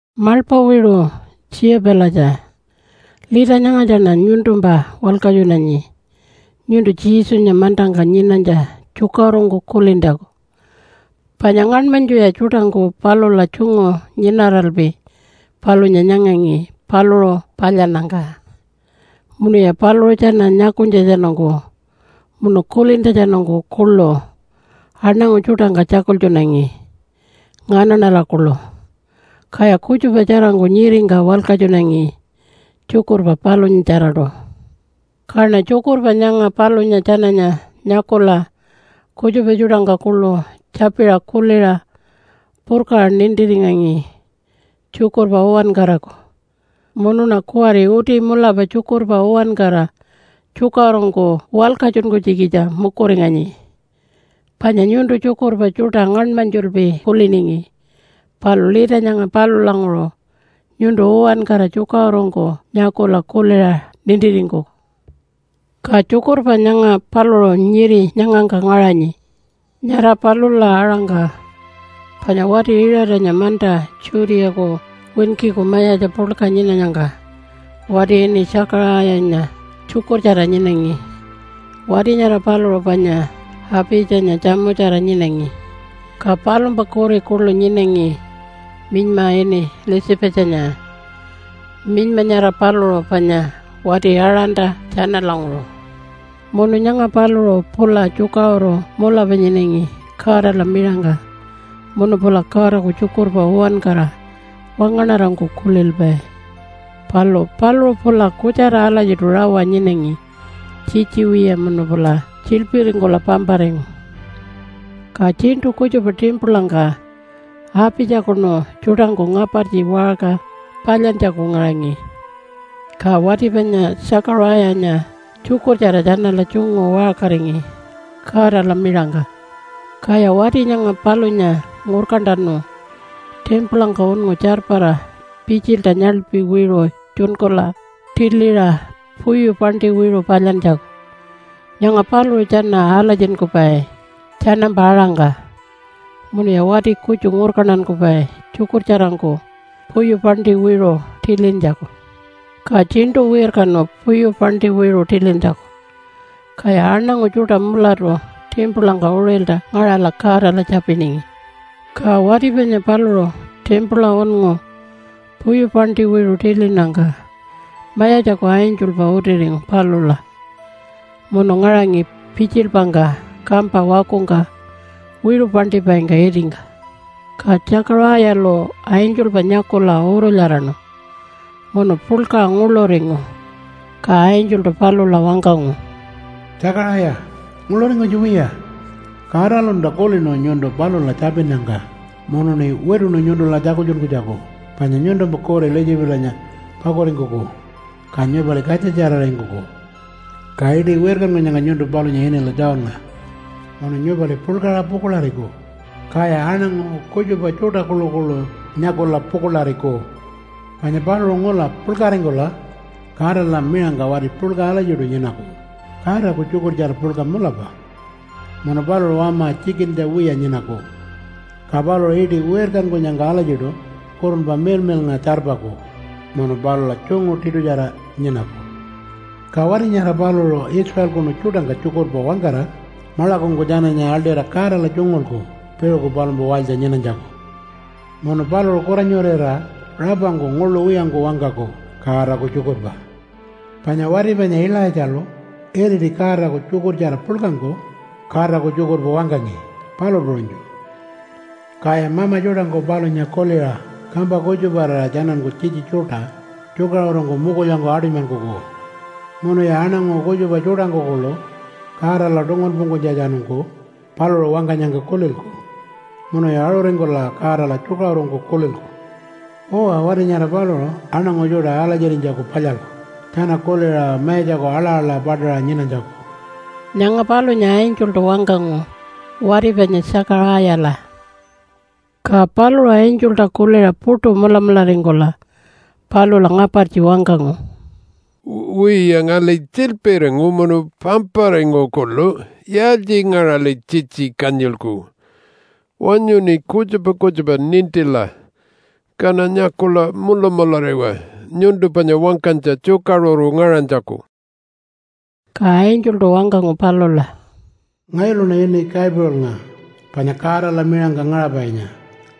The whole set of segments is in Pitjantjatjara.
Maḻpa wiṟu Tjiyapilatja, lita nyangatjaṉa nyuntumpa walkatjunanyi nyuntu Jesunya mantangka nyinanytja tjukaṟurungku kulintjaku. Panya ngaṉmanytjuya tjuṯangku palula tjungu nyinaralpi palunya nyangangi paluṟu palyannyangka. Munuya paluṟu tjana nyakunytjatjanungku munu kulintjatjanungku kuḻu aṉangu tjuṯangka tjakultjunangi nganaṉala kuḻu. Kaya kutjupa tjarangku nyiringka walkatjunangi tjukurpa palunyatjaraṯu. Kaṉa tjukurpa nyanga palunya tjananya nyakula, kutjupa tjuṯangka kuḻu tjapiṟa kuliṟa purkaṟa nintiringangi tjukurpa uwankaraku. Munuṉa kuwari uti mulapa tjukurpa uwankara tjukaṟurungku walkatjunkunytjikitja mukuringanyi. Panya nyuntu tjukurpa tjuṯa ngaṉmanytjulpi kuliningi, palu lita nyanga palulanguṟu nyuntu uwankara tjukaṟurungku nyakula kuliṟa nintiringkuku. Ka tjukurpa nyanga paluṟu nyiri nyangangka ngaṟanyi. Nyara palula aṟangka, panya wati Iṟatanya manta Judeaku winkiku mayatja puḻka nyinanyangka, wati ini Tjakaṟayanya tjukurtjara nyinangi. Wati nyara paluṟu panya Apitjanya tjamutjara nyinangi. Ka palumpa kuri kuḻu nyinangi minyma ini Elizabethanya. Minyma nyara paluṟu panya wati Aaronta tjanalanguṟu. Munu nyanga paluṟu pula tjukaṟuru mulapa nyinangi Godala miṟangka munu pula Godaku tjukurpa uwankara wangaṉarangku kulilpai. Palu paluṟu pula kutjara alatjiṯu rawa nyinangi tjitji wiya munu pula tjiḻpiringkula pamparingu. Ka tjiṉṯu kutjupa timpulangka Apitjakunu tjuṯangku ngapartji waṟka palyantjaku ngaṟangi, ka wati panya Tjakaṟayanya tjukurtjara tjanala tjungu waṟkaringi Godala miṟangka. Kaya wati nyanga palunya ngurkantanu timpulangka unngu tjarpara pitjilta nyaḻpi wiṟu tjunkula tiliṟa puyu paṉṯi wiṟu palyantjaku. Nyanga paluṟu tjana alatjinkupai tjanampa aṟangka, munuya wati kutju ngurkantankupai tjukurtjarangku puyu paṉṯi wiṟu tilintjaku. Ka tjiṉṯu wirkanu puyu paṉṯi wiṟu tilintjaku, kaya aṉangu tjuṯa mulapaṯu timpulangka uṟilta ngaṟala Godala tjapiningi. Ka wati panya paluṟu timpula unngu puyu paṉṯi wiṟu tilinnyangka Mayatjaku angelpa utiringu palula munu ngaṟangi pitjilpangka kampa wakungka wiṟu paṉṯipaingka itingka. Ka Tjakaṟayalu angelpa nyakula urulyaraṉu munu puḻkaṟa nguḻuringu. Ka angeltu palula wangkangu, “Tjakaṟaya, nguḻuringkunytja wiya. Godalunta kulinu nyuntu palula tjapinnyangka munuṉi wituṉu nyuntula tjakultjunkunytjaku panya nyuntumpa kuri Elizabethanya pakuringkuku, ka nyupali katjatjararingkuku. Ka iṯi wirkankunyangka nyuntu palunya inila Johnnga. Munu nyupali puḻkaṟa pukuḻariku, kaya aṉangu kutjupa tjuṯa kuḻukuḻu nyakula pukuḻariku. Panya paluṟu ngula puḻkaringkula Godala miṟangka wati puḻka alatjiṯu nyinaku Godaku tjukurtjara puḻka mulapa. Munu paluṟu wama tjikintja wiya nyinaku. Ka paluṟu iṯi wirkankunyangka alatjiṯu Kurunpa Miḻmiḻnga tjarpaku munu palula tjungu tiṯutjara nyinaku. Ka wati nyara paluṟu Israelkunu tjuṯangka tjukurpa wangkara maḻakungku tjananya aḻṯira Godala tjungulku piṟuku palumpa walytja nyinanytjaku. Munu paluṟu kuranyurira rapangku nguḻu wiyangku wangkaku Godaku tjukurpa, panya wati panya Ilaitjalu iriti Godaku tjukurtjara puḻkangku Godaku tjukurpa wangkangi, palu puṟunytju. Kaya mama tjuṯangku palunya kuliṟa kampa kutjuparira tjananku tjitji tjuṯa tjukaṟurungku mukulyangku aṯunymankuku. Munuya aṉangu kutjupa tjuṯangku kuḻu Godala tungunpungkunytjatjanungku paluṟu wangkanyangka kulilku munuya aṟuringkula Godala tjukaṟurungku kulilku. Uwa, wati nyara paluṟu aṉangu tjuṯa alatjirinytjaku palyalku tjana kuliṟa Mayatjaku aḻa-aḻa paṯaṟa nyinanytjaku.” Nyanga palunya angeltu wangkangu wati panya Tjakaṟayala. Ka paluṟu angelta kuliṟa puṯu mulamularingkula palula ngapartji wangkangu, “Wiya, ngali tjiḻpiringu munu pamparingu kuḻu. Yaaltjingaṟali tjitji kanyilku? Wanyuṉi kutjupa kutjupa nintila kaṉa nyakula mulamulariwa nyuntu panya wangkanytja tjukaṟuru ngaṟanytjaku.” Ka angeltu wangkangu palula, “Ngayuluṉa ini Gabrielnga panya Godala miṟangka ngaṟapainya.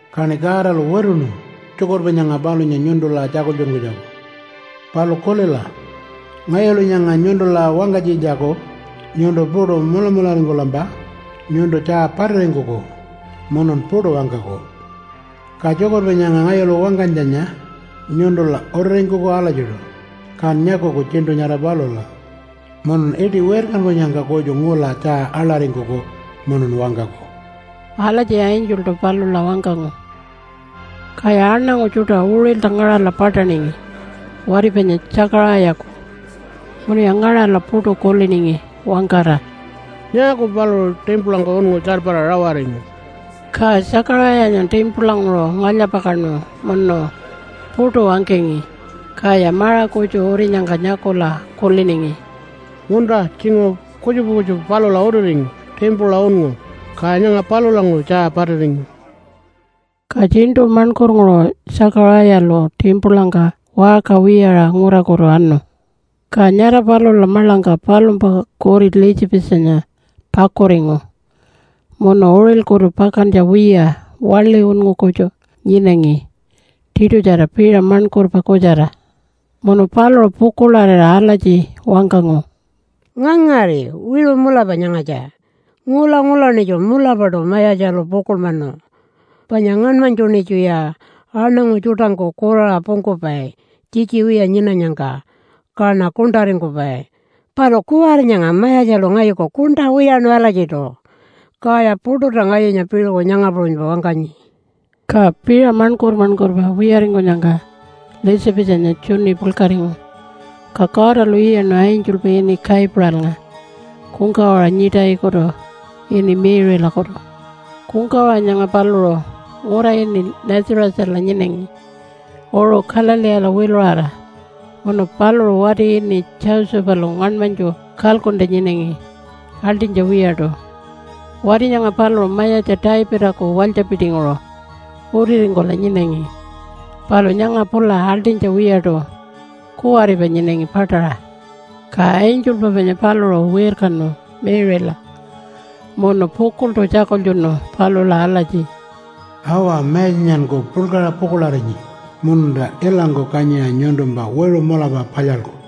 Kaṉi Godalu wituṉu tjukurpa nyanga palunya nyuntula tjakultjunkunytjaku. Palu kulila, ngayulu nyanga nyuntula wangkanytjitjaku nyuntu puṯu mulamularingkulampa nyuntu tjaa patiringkuku munun puṯu wangkaku. Ka tjukurpa nyanga ngayulu wangkanytjanya nyuntula utiringkuku alatjiṯu, kan nyakuku tjiṉṯu nyara palula, munun iṯi wirkankunyangka kutju ngula tjaa aḻaringkuku munun wangkaku.” Alatji angeltu palula wangkangu. Kaya aṉangu tjuṯa uṟilta ngaṟala paṯaningi wati panya Tjakaṟayaku munuya ngaṟala puṯu kuliningi wangkara, “Nyaaku paluṟu timpulangka unngu tjarpara rawaringu?” Ka Tjakaṟayanya timpulanguṟu ngalya-pakaṉu munu puṯu wangkangi. Kaya maṟa kutju urinyangka nyakula kuliningi, “Munta, tjinguṟu kutjupa kutjupa palula utiringu timpula unngu, ka nyanga palulanguṟu tjaa patiringu.” Ka tjiṉṯu maṉkurnguṟu Tjakaṟayalu timpulangka waṟka wiyaṟa ngurakutu anu. Ka nyara palula maḻangka palumpa kuri Elizabethanya pakuringu munu uṟilkutu pakantja wiya waḻi unngu kutju nyinangi tiṯutjara piṟa maṉkurpa kutjara. Munu paluṟu pukuḻarira alatji wangkangu, “Ngangari, wiṟu mulapa nyangatja. Ngula-ngulaṉitju mulapaṯu Mayatjalu pukuḻmanu. Panya ngaṉmanytjuṉitjuya aṉangu tjuṯangku kuraṟa pungkupai tjitji wiya nyinanyangka, kaṉa kuṉṯaringkupai. Palu kuwari nyanga Mayatjalu ngayuku kuṉṯa wiyaṉu alatjiṯu, kaya puṯulta ngayunya piṟuku nyanga puṟunypa wangkanyi.” Ka piṟa maṉkur-maṉkurpa wiyaringkunyangka Elizabethanya tjuni puḻkaringu. Ka Godalu iyaṉu angelpa ini Gabrielnga kungkawaṟa nyiṯayikutu ini Mary-lakutu. Kungkawaṟa nyanga paluṟu ngura ini Nazarethala nyinangi uṟu Galileela wiluṟara munu paluṟu wati ini Josephalu ngaṉmanytju kalkuntja nyinangi aḻṯinytja wiyaṯu. Wati nyanga paluṟu mayatja Davidaku walytjapitinguṟu utiringkula nyinangi. Palu nyanga pula aḻṯinytja wiyaṯu kuwaripa nyinangi paṯaṟa. Ka angelpa panya paluṟu wirkanu Mary-la munu pukuḻṯu tjakultjunu palula alatji, “Awa, Mayatjanyanku puḻkaṟa pukuḻarinyi, mununta ilangku kanyiṟa nyuntumpa wiṟu mulapa palyalku.”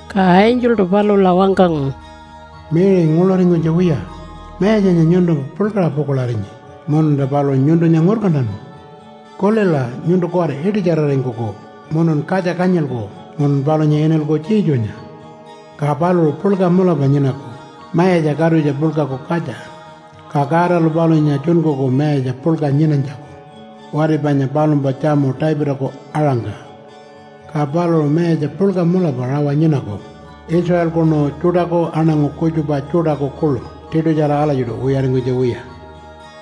Ka angeltu palula wangkangu, “Mary, nguḻuringkunytja wiya! Mayatjanya nyuntumpa puḻkaṟa pukuḻarinyi mununta paluṟu nyuntunya ngurkantanu. Kulila, nyuntu kuwari iṯitjararingkuku, munun katja kanyilku munun palunya inilku Jesunya. Ka paluṟu puḻka mulapa nyinaku Mayatja Katutja Puḻkaku katja. Ka Godalu palunya tjunkuku Mayatja puḻka nyinanytjaku wati panya palumpa tjamu Davidaku aṟangka. Ka paluṟu mayatja puḻka mulapa rawa nyinaku Israelkunu tjuṯaku aṉangu kutjupa tjuṯaku kuḻu tiṯutjara alatjiṯu wiyaringkunytja wiya.”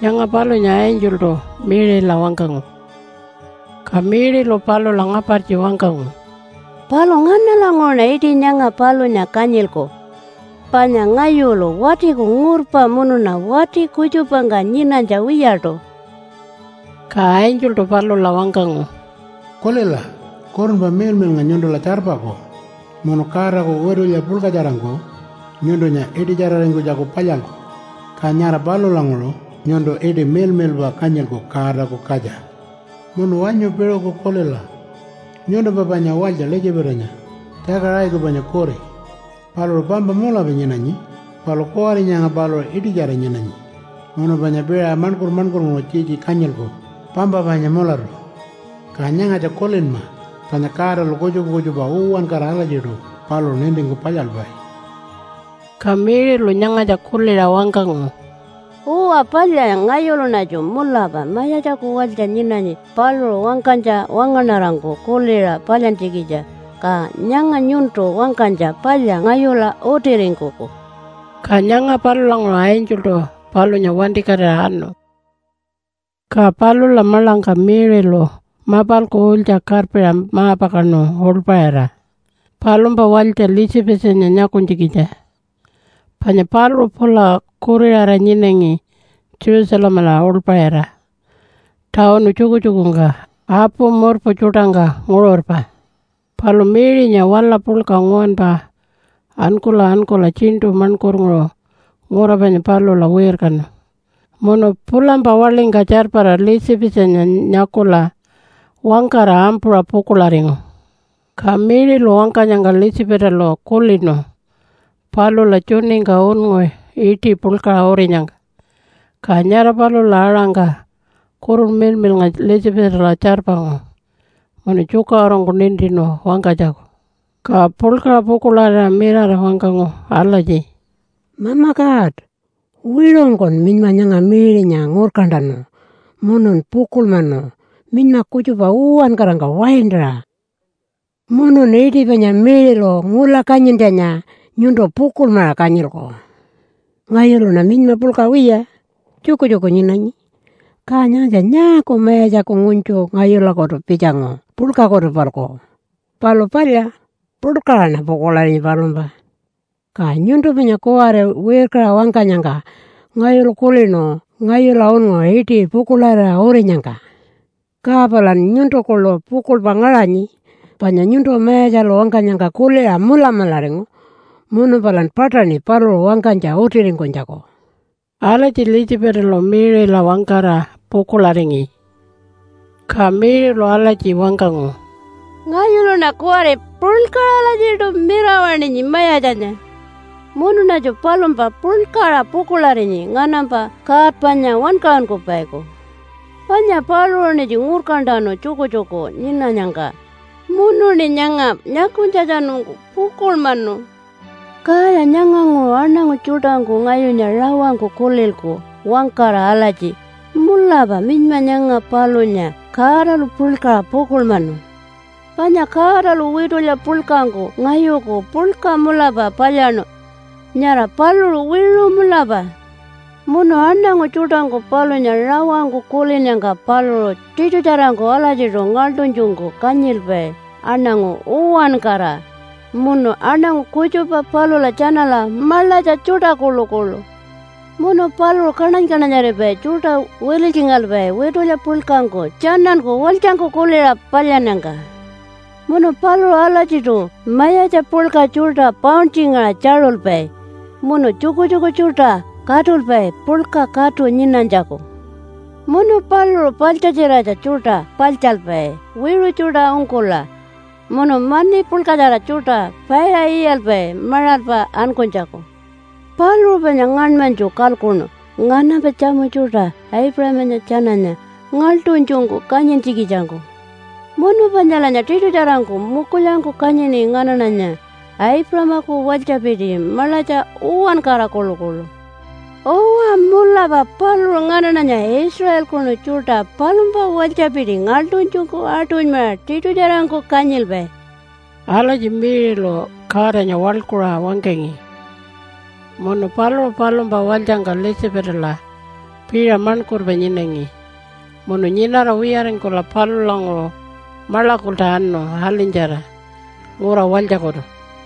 Nyanga palunya angeltu Mary-la wangkangu. Ka Mary-lu palula ngapartji wangkangu, “Palu nganalanguṟuṉa iṯi nyanga palunya kanyilku? Panya ngayulu watiku ngurpa munuṉa wati kutjupangka nyinanytja wiyaṯu.” Ka angeltu palula wangkangu, “Kulila, Kurunpa Miḻmiḻnga nyuntula tjarpaku munu Godaku witulya puḻkatjarangku nyuntunya iṯitjararingkunytjaku palyalku. Ka nyara palulanguṟu nyuntu iṯi miḻmiḻpa kanyilku ‘Godaku Katja.’ Munu wanyu piṟuku kulila, nyuntumpa panya walytja Elizabethanya, Tjakaṟayaku panya kuri. Paluṟu pampa mulapa nyinanyi. Palu kuwari nyanga paluṟu iṯitjara nyinanyi. Munu panya piṟa maṉkur-maṉkurnguṟu tjitji kanyilku pampa panya mulatu. Ka nyangatja kulinma panya Godalu kutjupa kutjupa uwankara alatjiṯu paluṟu nintingku palyalpai.” Ka Mary-lu nyangatja kuliṟa wangkangu, “Uwa palya, ngayuluṉatju mulapa Mayatjaku walytja nyinanyi paluṟu wangkanytja wangaṉarangku kuliṟa palyantjikitja. Ka nyanga nyuntu wangkanytja palya ngayula utiringkuku.” Ka nyanga palulanguṟu angeltu palunya wantikatira anu. Ka palula maḻangka Mary-lu mapalku ulytja karpiṟa ma-pakaṉu uḻpaṟira palumpa walytja Elizabethanya nyakunytjikitja. Panya paluṟu pula kuriṟara nyinangi Jerusalemala uḻpaṟira tawunu tjukutjukungka apu murpu tjuṯangka nguṟurpa. Palu Mary-nya wala puḻka nguwanpa ankula ankula tjiṉṯu maṉkurnguṟu ngura panya palula wirkanu munu pulampa waḻingka tjarpara Elizabethanya nyakula wangkara ampuṟa pukuḻaringu. Ka Mary-lu wangkanyangka Elizabethalu kulinu palula tjuningka unngu iṯi puḻkaṟa urinyangka. Ka nyara palula aṟangka Kurunpa Miḻmiḻnga Elizabethala tjarpangu munu tjukaṟurungku nintinu wangkanytjaku, ka puḻkaṟa pukuḻarira mirara wangkangu alatji, “Mama God, wiṟungkun minyma nyanga Mary-nya ngurkantanu munun pukuḻmanu minyma kutjupa uwankarangka waintaṟa, munun iṯi panya Mary-lu ngula kanyintjanya nyuntu pukuḻmaṟa kanyilku. Ngayuluṉa minyma puḻka wiya, tjukutjuku nyinanyi, ka nyangatja nyaaku Mayatjaku ngunytju ngayulakutu pitjangu puḻkakutu-palku? Palu palya, puḻkaṟaṉa pukuḻarinyi palumpa. Ka nyuntu panya kuwari wirkaṟa wangkanyangka ngayulu kulinu ngayula unngu iṯi pukuḻarira urinyangka. Ka palan nyuntu kuḻu pukuḻpa ngaṟanyi panya nyuntu Mayatjalu wangkanyangka kuliṟa mulamularingu munu palan paṯaṉi paluṟu wangkanytja utiringkunytjaku.” Alatji Elizabethalu Mary-la wangkara pukuḻaringi. Ka Mary-lu alatji wangkangu, “Ngayuluṉa kuwari puḻkaṟa alatjiṯu mirawaṉinyi Mayatjanya, Munuṉatju palumpa puḻkaṟa pukuḻarinyi, nganampa God panya Wankaṟunkupaiku. Panya paluṟuṉitju ngurkantanu tjukutjuku nyinanyangka munuṉi nyanga nyakunytjatjanungku pukuḻmanu. Kaya nyanganguṟu aṉangu tjuṯangku ngayunya rawangku kulilku wangkara alatji, ‘Mulapa minyma nyanga palunya Godalu puḻkaṟa pukuḻmanu.’ Panya Godalu witulya puḻkangku ngayuku puḻka mulapa palyaṉu. Nyara paluṟu wiṟu mulapa. Munu aṉangu tjuṯangku palunya rawangku kulinnyangka paluṟu tiṯutjarangku alatjiṯu ngaḻṯunytjungku kanyilpai aṉangu uwankara, munu aṉangu kutjupa palula tjanala maḻatja tjuṯa kuḻukuḻu. Munu paluṟu kaṉany-kaṉanyaripai tjuṯa wililytjingalpai witulya puḻkangku tjananku walytjangku kuliṟa palyannyangka. Munu paluṟu alatjiṯu mayatja puḻka tjuṯa pauntjingaṟa tjaṟulpai, munu tjukutjuku tjuṯa katulpai puḻka katu nyinanytjaku. Munu paluṟu paḻtjatjiratja tjuṯa paḻtjalpai wiṟu tjuṯa ungkula, munu mani puḻkatjara tjuṯa paiṟa iyalpai maṟalpa ankunytjaku. Paluṟu panya ngaṉmanytju kalkuṉu nganampa tjamu tjuṯa Aipuṟamanya tjananya, ngaḻṯunytjungku kanyintjikitjangku munu panyalanya tiṯutjarangku mukulyangku kanyini nganaṉanya, Aipuṟamaku walytjapiti maḻatja uwankara kuḻukuḻu. Uwa, mulapa paluṟu nganaṉanya Israelkunu tjuṯa palumpa walytjapiti ngaḻṯunytjungku aṯunymaṟa tiṯutjarangku kanyilpai.” Alatji Mary-lu Godanya waḻkuṟa wangkangi. Munu paluṟu palumpa walytjangka Elizabethala piṟa maṉkurpa nyinangi, munu nyinara wiyaringkula palulanguṟu maḻakulta anu alinytjara ngura walytjakutu.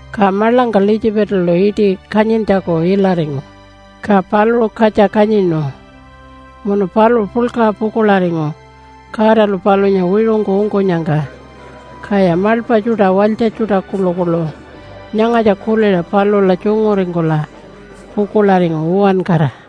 Ka maḻangka Elizabethalu iṯi kanyintjaku ilaringu, ka paluṟu katja kanyinu. Munu paluṟu puḻkaṟa pukuḻaringu Godalu palunya wiṟungku ungkunyangka. Kaya maḻpa tjuṯa walytja tjuṯa kuḻukuḻu nyangatja kuliṟa palula tjunguringkula pukuḻaringu uwankara.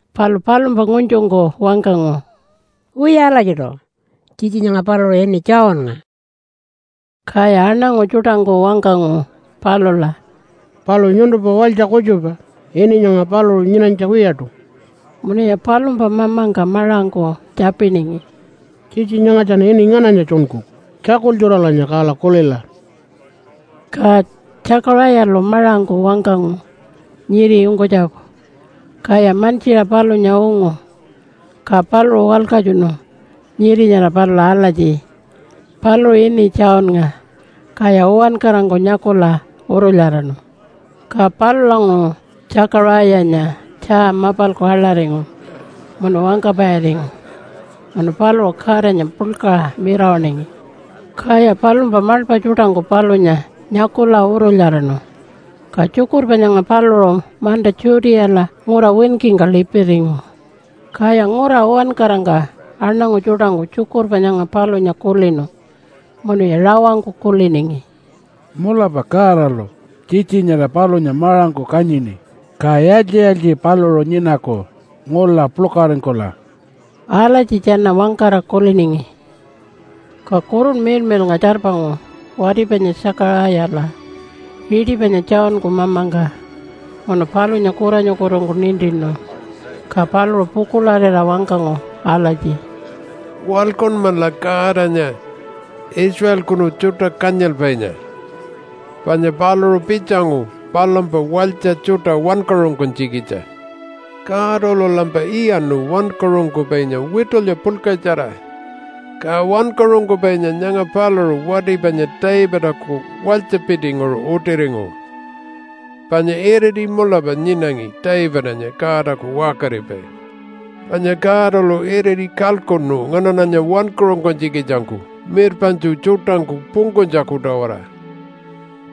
Palu palumpa ngunytjungku wangkangu, “Wiya alatjiṯu, tjitji nyanga paluṟu ini Johnnga.” Kaya aṉangu tjuṯangku wangkangu palula, “Palu nyuntumpa walytja kutjupa ini nyanga paluṟu nyinanytja wiyaṯu.” Munuya palumpa mamangka maṟangku tjapiningi, “Tjitji nyangatjan ini ngananya tjunkuku? Tjakultjuralanya kala kulila.” Ka Tjakaṟayalu maṟangku wangkangu nyiri ungkunytjaku. Kaya mantjiṟa palunya ungu. Ka paluṟu walkatjunu nyiri nyara palula alatji, “Paluṟu ini Johnnga.” Kaya uwankarangku nyakula urulyaraṉu. Ka palulanguṟu Tjakaṟayanya tjaa mapalku aḻaringu munu wangkapairingu, munu paluṟu Godanya puḻkaṟa mirawaṉingi. Kaya palumpa maḻpa tjuṯangku palunya nyakula urulyaraṉu. Ka tjukurpa nyanga paluṟu manta Judeala ngura winkingka lipiringu. Kaya ngura uwankarangka aṉangu tjuṯangku tjukurpa nyanga palunya kulinu munuya rawangku kuliningi, “Mulapa Godalu tjitji nyara palunya maṟangku kanyini. Ka yaaltji-yaaltji paluṟu nyinaku ngula puḻkaringkula?” Alatji tjana wangkara kuliningi. Ka Kurunpa Miḻmiḻnga tjarpangu wati panya Tjakaṟayala, iṯi panya Johnku mamangka munu palunya kuranyukutungku nintinu, ka paluṟu pukuḻarira wangkangu alatji, “Waḻkunmala Godanya, Israelkunu tjuṯa kanyilpainya, panya paluṟu pitjangu palumpa walytja tjuṯa wankaṟunkunytjikitja. Godalulampa iyaṉu wankaṟunkupainya witulya puḻkatjara. Ka wankaṟunkupainya nyanga paluṟu wati panya Davidaku walytjapitinguṟu utiringu. Panya iriti mulapa nyinangi Davidanya Godaku waṟkaripai. Panya Godalu iriti kalkuṉu nganaṉanya wankaṟunkunytjikitjangku mirpaṉtju tjuṯangku pungkunytjaku-tawara,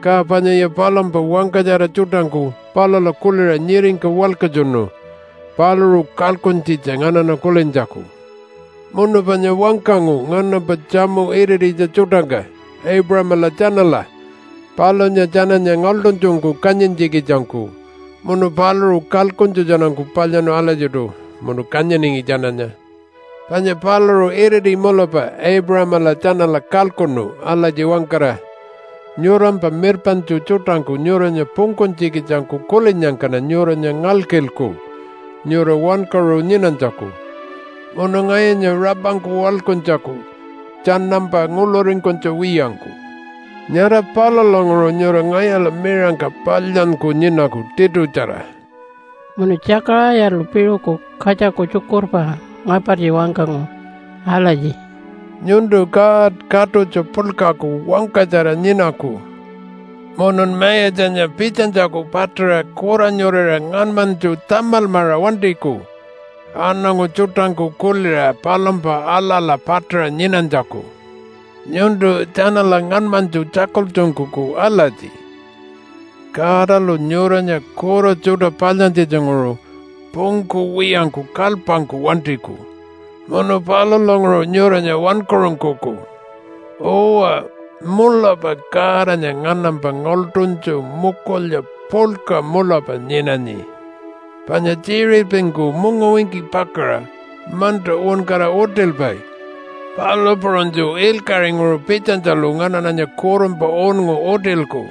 ka panyaya palumpa wangkatjara tjuṯangku palula kuliṟa nyiringka walkatjunu paluṟu kalkuntjitja nganaṉa kulintjaku. Munu panya wangkangu nganampa tjamu irititja tjuṯangka Aipuṟamala tjanala palunya tjananya ngaḻṯunytjungku kanyintjikitjangku munu paluṟu kalkuntjatjanungku palyaṉu alatjiṯu munu kanyiningi tjananya. Panya paluṟu iriti mulapa Aipuṟamala tjanala kalkuṉu alatji wangkara, ‘Nyurampa mirpaṉtju tjuṯangku nyuranya pungkunytjikitjangku kulinnyangkaṉa nyuranya ngalkilku nyura wankaṟu nyinanytjaku munu ngayunya rapangku waḻkuntjaku tjanampa nguḻuringkunytja wiyangku. Nyara palulanguṟu nyura ngayula miṟangka palyanyku nyinaku tiṯutjara.’” Munu Tjakaṟayalu piṟuku katjaku tjukurpa ngapartji wangkangu alatji, “Nyuntu God Katutja Puḻkaku wangkatjara nyinaku, munun Mayatjanya pitjanytjaku paṯaṟa kuranyurira ngaṉmanytju tamalmaṟa wantiku aṉangu tjuṯangku kuliṟa palumpa aḻa-aḻa paṯaṟa nyinanytjaku. Nyuntu tjanala ngaṉmanytju tjakultjunkuku alatji, ‘Godalu nyuranya kura tjuṯa palyantjitjanguṟu pungkuwiyangku kalypangku wantiku munu palulanguṟu nyuranya wankaṟunkuku.’ Uwa, mulapa Godanya nganampa ngaḻṯunytju mukulya puḻka mulapa nyinanyi. Panya tjiṟirpingku mungawinki pakaṟa manta uwankara utilpai, palu puṟunytju ilkaṟinguṟu pitjanytjalu nganaṉanya kurunpa unngu utilku.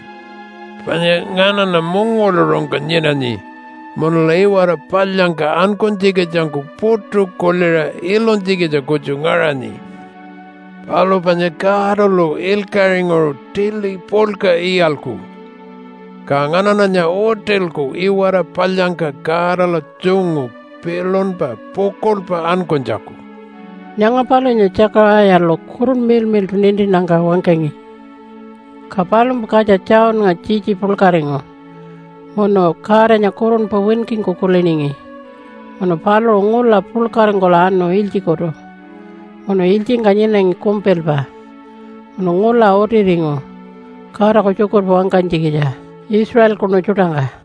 Panya nganaṉa mungawaḻuṟungka nyinanyi munula iwara palyangka ankunytjikitjangku puṯu kuliṟa ilunytjikitja kutju ngaṟanyi. Palu panya Godalu ilkaṟinguṟu tili puḻka iyalku, ka nganaṉanya utilku iwara palyangka Godala tjungu pilunpa pukuḻpa ankunytjaku.” Nyanga palunya Tjakaṟayalu Kurunpa Miḻmiḻṯu nintinnyangka wangkangi. Ka palumpa katja Johnnga tjitji puḻkaringu, munu Godanya kurunpa winkingku kuliningi. Munu paluṟu ngula puḻkaringkula anu ilytjikutu munu ilytjingka nyinangi kumpilpa, munu ngula utiringu Godaku tjukurpa wangkanytjikitja Israelkunu tjuṯangka.